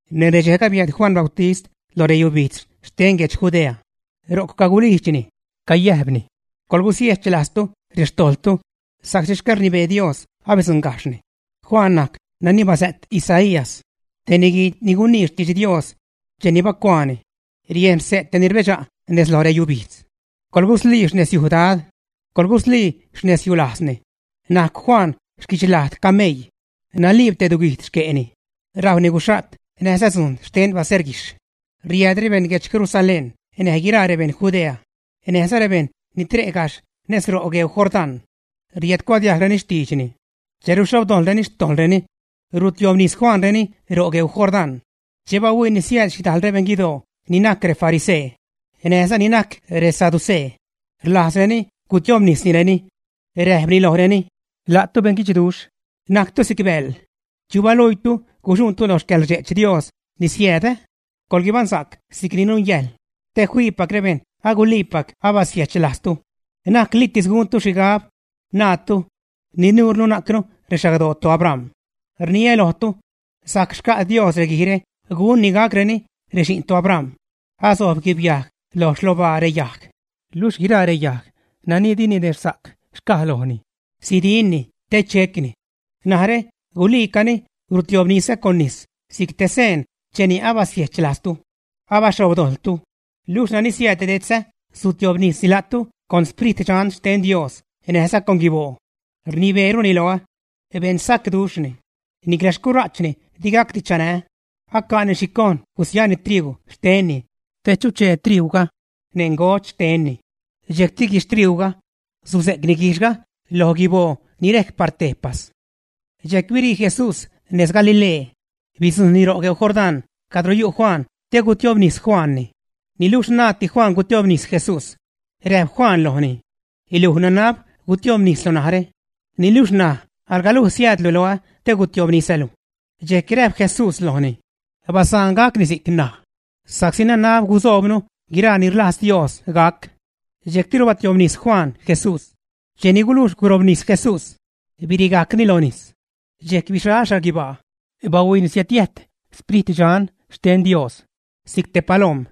Neṉ redxejga biääd Juan Bautist lo reyubijdz xten guedx Judea, ro'c cagulijdxni, cayäjpni: ―Coḻgusiechlajztu rextojḻtu sa'csi xcäḻrnibee Dios abidzuṉgajxhni. Juan najc nani basä't Isaías, te niguii ni gunii xtidx Dios, cheni bacuaani: Riejn xse' te ni rbedxa' nez lo reyubijdz: “Coḻguslii xnezyuj Dad, coḻguslii xnezyulajzni.” Najcw Juan xquichlajd cameii. Naliib te duguijd xque'ni. Rajwni guxha't näjza dzujn xten baseerguijxh. Riääd rebeṉ guedx Jerusalén näj guiraa rebeṉ Judea näjza rebejṉ ni tre' gajxh nez ro' gueu Jordán, riädcuadiajgreni xtiidxni. Che ruxhobdojḻreni xtojḻreni, rutiobnis Juanreni ro' gueu Jordán. Che bahuiini siääd xhidajl rebeṉ guidoo ni najc refarisee näjza ni najc resaducee, rlajzreni gutiobnisnireni, räjpni lojreni: ―La'tu beṉguidxduxh, najctu si'c bäḻ. ¿Chu balijdxtu guxuṉtu loj xcäḻrdxe'ch Dios ni siääd? Coḻguibaṉsa'c si'cni nungäjḻ te fiipac rebejṉ guliipac abasiechlajztu. Na'c litis guntu xhigab naatu: “¡Ni nurnu najcnu rexagdoo toAbram!” Rniliä lojtu, sajc xca' Dios reguijre gunni gacreni rexi'n toAbram. Asojb guibyajg lo xlobaa reyajg, luxh guiraa reyajg nani di ninexhsa'c xcaj lojni, sidinni te checni. Narä guliicani rustiobnisä con nis si'c te seen cheni abasiechlajztu, abaxhobdojḻtu. Niluxh nani siääd detzä sutiobnisni la'tu con Sprit Dxan xten Dios näjza con guiboo. Rnibeeruni loä. Beṉsacduxhni. Nicla xcura'chni digacdi chanää́. Aca'ni xhi cojn gusiani triuu xtenni te chuchee triuuga neṉ ngodx xtenni. Dxejcti guixhtriuuga, suze'cni guijxhga lo guiboo ni rejc par tejpas. Dxejc birii Jesús nez Galilee, bidzujṉni ro' gueu Jordán cadro yu' Juan te gutiobnis Juanni. Niluxh naaddi Juan gutiobnis Jesús. Räjp Juan lojni: ―Luj nanab gutiobnislu narä, niluxh ṉaj alga luj siäädlu loä te gutiobnisälu. Dxejc räjp Jesús lojni: ―Basaan gacni si'c ṉaj, sa'csi nanab gusoobnu guiraa ni rlajz Dios gac. Dxejctiru batiobnis Juan Jesús. Cheni gulujx gurobnis Jesús, birigajcni lo nis. Dxejc bixal xhaguibaa, bahuiini siädyäjt Sprit Dxan xten Dios si'c te palom,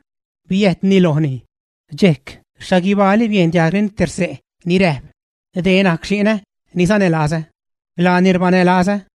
biäjtni lojni. Dxejc xhaguibaali biejn diajgreni te xse' ni räjp: ―Dee najc xi'nä ni sanälazä. Laani rbanälazä.